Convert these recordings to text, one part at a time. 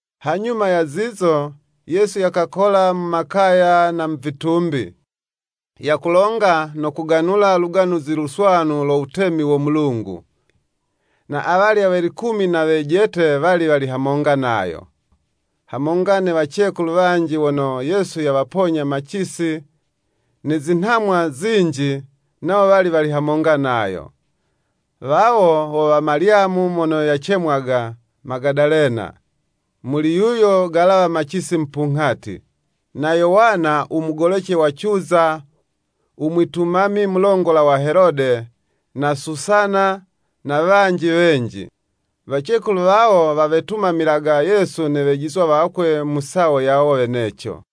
Hanyuma ya zizo, Yesu yakakola mu makaya na mu vitumbi, yakulonga no kuganula Luganuzi Luswanu lo wutemi wo Mulungu. Na awalya we likumi na wejete wali wali hamonga nayo. Hamonga ne wacekulu wanji wono Yesu yawaponya macisi ne zinhamwa zinji, nawo wali wali hamonga nayo. Wawo wo wa Malyamu mono (yacemwaga Magadalena,) muli yuyo galawa macisi mupunghati. Na Yowana u mugolece wa Cuza u mwitumami mulongola wa Helode, na Susana, na wanji wenji. Wacekulu wawo wawetumamilaga Yesu ne wejizwa wakwe mu sawo yawo weneco.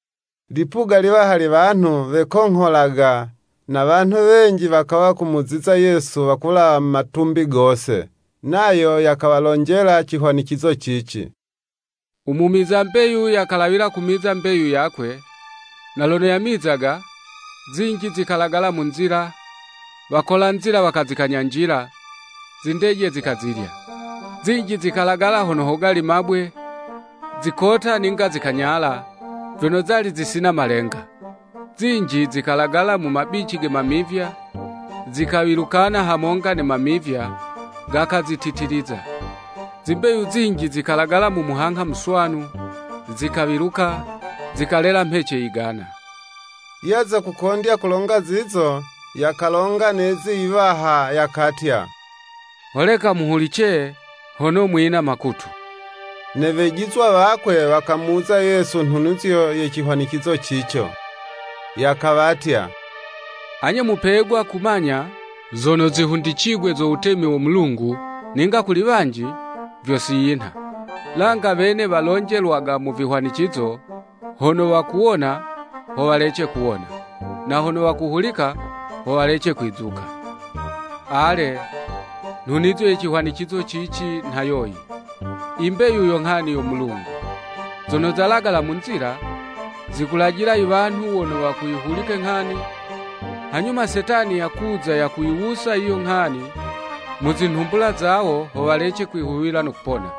Lipuga liwaha lye wanhu, wekongholaga, na wanhu wenji wakawa kumuziza Yesu wakulawa mu matumbi gose. Nayo yakawalonjela cihwanicizo cici, “U mumiza mbeyu yalawila kumiza mbeyu yakwe, na lono yamizaga, zinji zikalagala mu nzila; wakola nzila wakazikanyanjila, zindeje zikazilya. Zinji zikalagala hono hogali mabwe, zikota ninga zikanyala, vyono zali zisina malenga. Zinji zikalagala mu mabici ge mamivya, zikawilukana hamonga ne mamivya, gakazititiliza. Zimbeyu zinji zikalagala mu muhangha muswanu, zikawiluka, zikalela mhece yigana.” Yaza kukondya kulonga zizo, yakalonga ne yizi yiwaha, yakatya “Holeka muhulice, hono mwina makutu.” Ne wejizwa wakwe wakamuwuza Yesu nhunizo ye cihwanicizo cico. Yakawatya, “Anye mupegwa kumanya zono zihundicigwe zo wutemi wo Mulungu, ninga kuli wanji, vyo si yinha. Langa wene walonjelwaga mu vihwanicizo, hono wakuwona, ho walece kuwona, na hono wakuhulika, ho walece kwizuka.” Ale, ne nhunizo ye cihwanicizo cici nha yoyi. I mbeyu yo nghani yo Mulungu. Zono zalagala mu nzila, zikulajila iwanhu wono wakuyihulika nghani, hanyuma Setani yakuza yakuyiwusa yiyo nghani mu zinhumbula zawo, ho walece kwihuwila no kupona.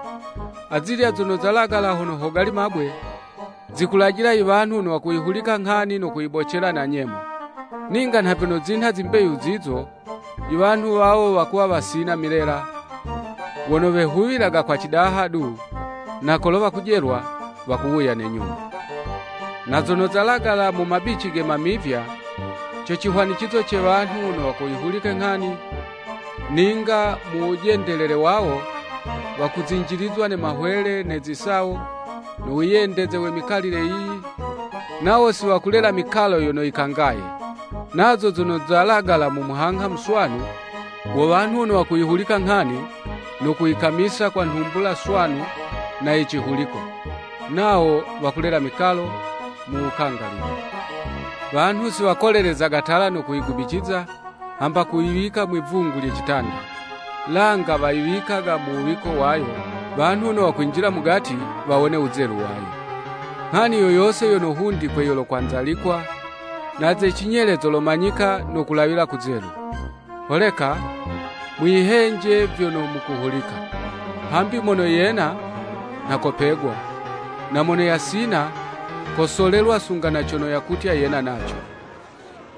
Azilya zono zalagala hono hogali mabwe, zikulajila iwanhu wono wakuyihulika nghani no kuyibocela na nyemo. Ninga nha vyono zinha zimbeyu zizo, iwanhu wawo wakuwa wasina milela, wono wehuwilaga kwa cidaha du, na kolo wakujelwa, wakuwuya ne nyuma. Na zono zalagala mu mabici ge mamivya, co cihwanicizo ce wanhu wono wakuyihulika nghani, ninga mu wujendelele wawo, wakuzinjilizwa ne mahwele ne zisawo, no wiyendeze we mikalile yiyi, nawo siwakulela mikalo yono yikangaye. Nazo zono zalagala mu muhangha muswanu wo wanhu wono wakuyihulika nghani, no kuyikamisa kwa nhumbula swanu na ye cihuliko. Nawo wakulela mikalo mu wukangalile. “Wanhu si wakolelezaga tala no kuyigubiciza, hamba kuyiwika mwi'vungu lye citanda; langa wayiwikaga ha wuwiko wayo, wanhu wono wakwinjila mugati, wawone wuzelu wayo. Nghani yo yose yono hundikwe yolokwanzalikwa, na ze cinyele zolomanyika, no kulawila kuzelu. Holeka mwiyihenje vyono mukuhulika. Hambi mono yena, nha kopegwa; na mono yasina, kosolelwa sunga na cono yakutya yena naco.”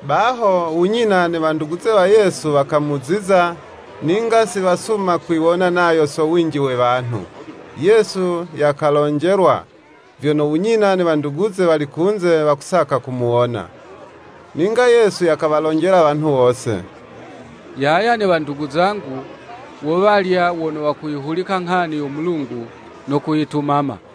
Baho, u nyina ne wanduguze wa Yesu wakamuziza, ninga si wasuma kwiwona nayo so winji we wanhu. Yesu yakalonjelwa, vyono u nyina ne wanduguze wali kunze, wakusaka kumuwona. Ninga Yesu yakawalonjela wanhu wose, “Yaya ne wandugu zangu, wo walya wono wakuyihulika nghani yo Mulungu no kuyitumama.”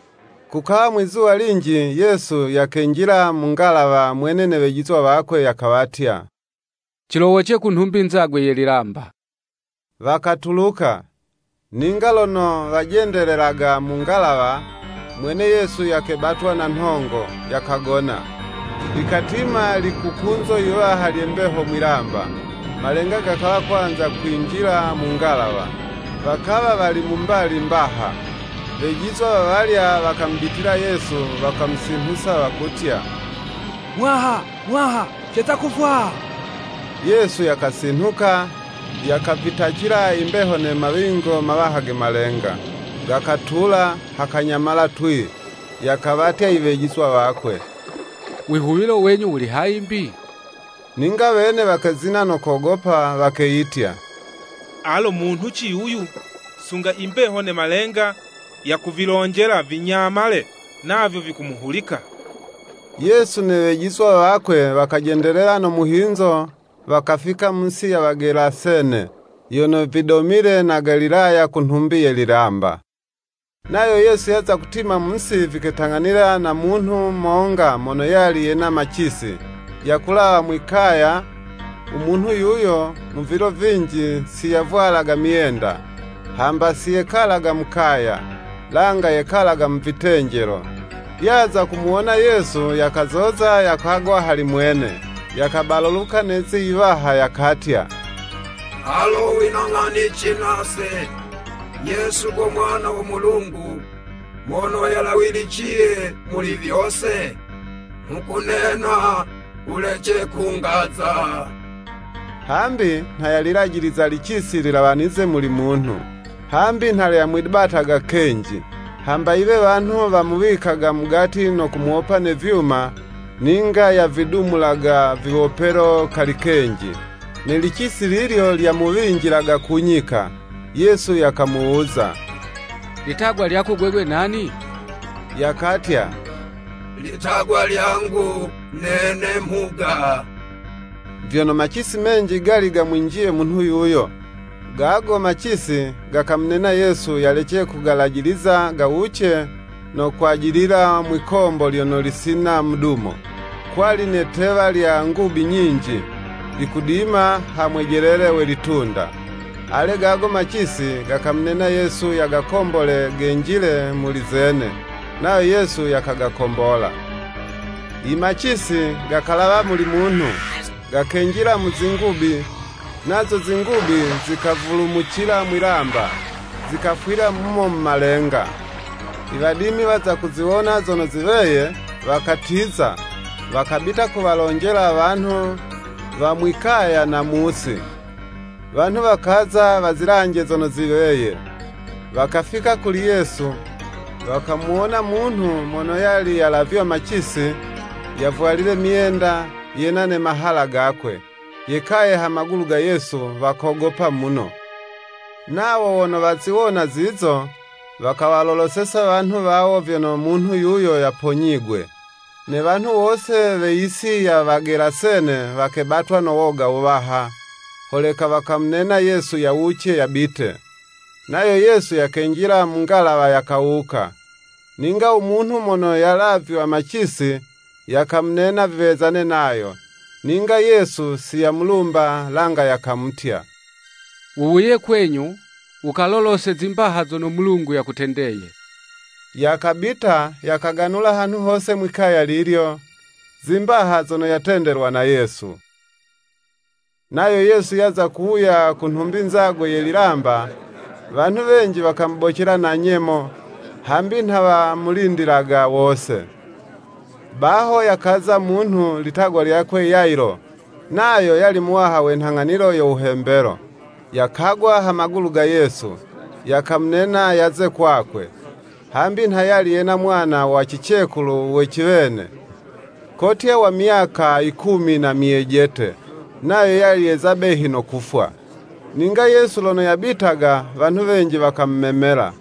Kukawa mwizuwa linji, Yesu yakenjila mu ngalawa mwene ne Wejizwa wakwe; yakawatya, “Cilowoce ku nhumbi nzagwe ye lilamba.” Wakatuluka. Ninga lono wajendelelaga mu ngalawa, mwene Yesu yakebatwa na nhongo, yakagona. Likatima likukunzo yiwaha lye mbeho mwilamba: malenga gakawa kwanza kwinjila mu ngalawa, wakawa wali mu mbali mbaha. Wejizwa wawalya wakamubitila Yesu, wakamusinhusa wakutya “Muwaha, Muwaha, ceza kufwa!” Yesu yakasinhuka, yakavitacila imbeho ne mawingo mawaha ge malenga, gakatula, hakanyamala twii. Yakawatya i wejizwa wakwe “Wihuwilo wenyu wuli hayi 'mbi? Ninga wene wakezina no kogopa, wakeyitya, Alo munhuci yuyu, sunga i mbeho ne malenga yakuvilonjela, vinyamale, navyo vikumuhulika!” Yesu ne wejizwa wakwe wakajendelela no muhinzo wakafika mu yisi ya Wagelasene, yono vidomile na Galilaya ku nhumbi ye lilamba. Nayo Yesu yaza kutima mu'si viketang'anila na munhu monga mono yali yena macisi, yakulawa mwi'kaya, u munhu yuyo mu vilo vinji si yavwalaga myenda, hamba si yekalaga mu kaya, langa yekalaga mu vitenjelo. Yaza kumuwona Yesu, yakazoza, yakagwa hali mwene, yakabalaluka na lizi yiwaha yakatya, “Alo wina nghanici nase, Yesu go Mwana wo Mulungu Mono Yalawiliciye Muli Vyose? Nghukunena wulece kungaza.” Hambi nha yalilajiliza licisi lilawanize muli munhu. Hambi nha lyamwibataga kenji. Hamba yiwe wanhu wamuwikaga mugati no kumuwopa ne vyuma; ninga yavidumulaga viwopelo kali kenji, ne licisi lilyo lyamuwinjilaga ku nyika. Yesu yakamuwuza, litagwa lyako gwegwe nani? Yakatya litagwa lyangu nene “Mhuga,” vyono macisi menji gali gamwinjiye munhu yuyo. Gago macisi gakamunena Yesu yalece kugalajiliza gawuce no kwajilila mwikombo lyono lisina mudumo. Kwali ne 'tewa lya ngubi nyinji, likudima ha mwejelele we litunda. Ale gago macisi gakamunena Yesu yagakombole genjile muli zene. Nayo Yesu yakagakombola. Imacisi gakalawa muli munhu, gakenjila mu zingubi, nazo zingubi zikavulumucila mwilamba, zikafwila mumo mu malenga. I wadimi waza kuziwona zono ziweye, wakatiza, wakabita kuwalonjela wanhu wa mwi'kaya na mu'si. Wanhu wakaza wazilanje zono ziweye; wakafika kuli Yesu, wakamuwona munhu mono yali yalavywa macisi, yavwalile myenda, yena ne mahala gakwe; yekaye ha magulu ga Yesu, wakogopa muno. Nawo wono waziwona zizo, wakawaloloseza wanhu wawo vyono munhu yuyo yaponyigwe. Ne wanhu wose we yisi ya Wagelasene wakebatwa no woga wuwaha, holeka wakamunena Yesu yawuce, yabite. Nayo Yesu yakenjila mu ngalawa, yakawuka. Ninga u munhu mono yalavywa macisi, yakamunena viwezane nayo, ninga Yesu si yamulumba, langa yakamutya. “Wuwuye kwenyu, wukalolose zimbaha zono Mulungu yakutendeye.” Yakabita, yakaganula hanhu hose mwi'kaya lilyo, zimbaha zono yatendelwa na Yesu. Nayo Yesu yaza kuwuya ku nhumbi nzagwe ye lilamba, wanhu wenji wakamubocela na nyemo, hambi nha wamulindilaga wose. Baho yakaza munhu, litagwa lyakwe Yayilo, nayo yali muwaha we nhang'anilo yo wuhembelo, yakagwa ha magulu ga Yesu, yakamunena yaze kwakwe; hambi nha yali yena mwana wa cicekulu we ciwene, kotya wa myaka yikumi na myejete, nayo yali yeza behi no kufwa. Ninga Yesu lono yabitaga wanhu wenji wakamumemela.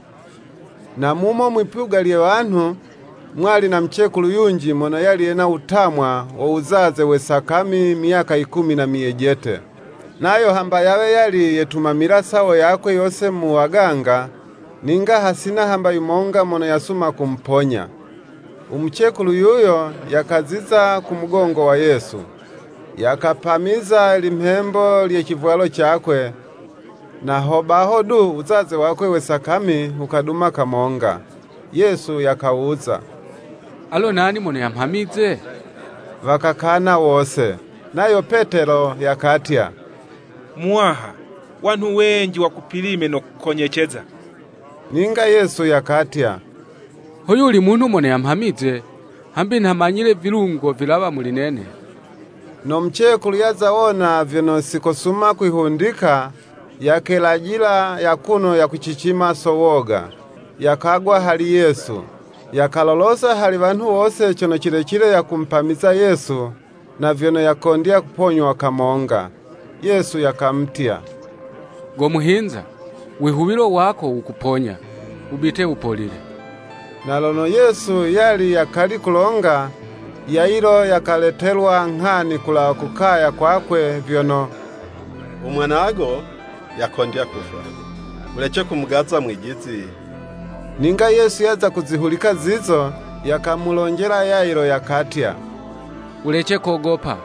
Na mumo mwi'puga lye wanhu, mwali na mucekulu yunji mono yali yena wutamwa wo wuzaze we sakami myaka yikumi na myejete, [nayo hamba yawe yali yetumamila sawo yakwe yose mu waganga,] ninga hasina hamba yumonga mono yasuma kumuponya. U mucekulu yuyo, yakaziza ku mugongo wa Yesu, yakapamiza limhembo lye civwalo cakwe, na hobaho du, u wuzaze wakwe we sakami wukaduma kamonga. Yesu yakawuza, “Alo nani mono yamhamize?” Wakakana wose. Nayo Petelo yakatya, “Muwaha, wanhu wenji wakupilime no kukonyeceza.” Ninga Yesu yakatya, “Ho yuli munhu mono yamhamize, hambi nha manyile vilungo vilawa muli nene.” No mucekulu yaza wona vyono si kosuma kwihundika, yakelajila akuno yakucicima so woga, yakagwa hali Yesu, yakalolosa hali wanhu wose cono cilecile yakumupamiza Yesu, na vyono yakondya kuponywa kamonga. Yesu yakamutya, “Go muhinza, wihuwilo wako wukuponya, wubite wupolile.” Na lono Yesu yali yakali kulonga, Yayilo yakaletelwa nghani kulawa ku kaya kwakwe, vyono, “U mwanago yakondya kufwa, wulece kumugaza Mwijizi.” Ninga Yesu yaza kuzihulika zizo, yakamulonjela Yayilo yakatya, “Wulece kogopa.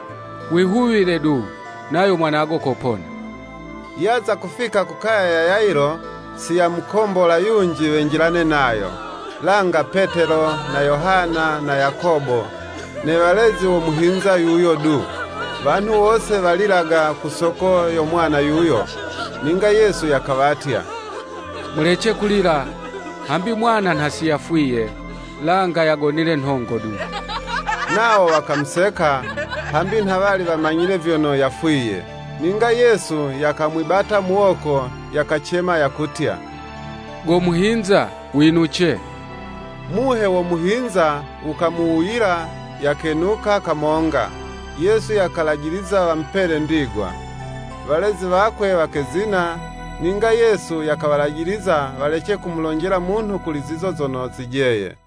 Wihuwile du, nayo mwanago kopona.” Yaza kufika kukaya ya Yayilo si yamukombola yunji wenjilane nayo, langa Petelo, na Yohana, na Yakobo, ne walezi wo muhinza yuyo du. Wanhu wose, walilaga, ku soko yo mwana yuyo. Ninga Yesu yakawatya, “Mulece kulila, hambi mwana nha siyafwiye, langa yagonile nhongo du.” Nawo wakamuseka, hambi nha wali wamanyile vyono yafwiye. Ninga Yesu yakamwibata muwoko, yakacema yakutya “Go muhinza winuce.” Muhe wo muhinza wukamuwuyila, yakenuka kamonga, Yesu yakalajiliza wamupele ndigwa. Walezi wakwe wakezina, ninga Yesu yakawalajiliza, walece kumulonjela munhu kuli zizo zono zijeye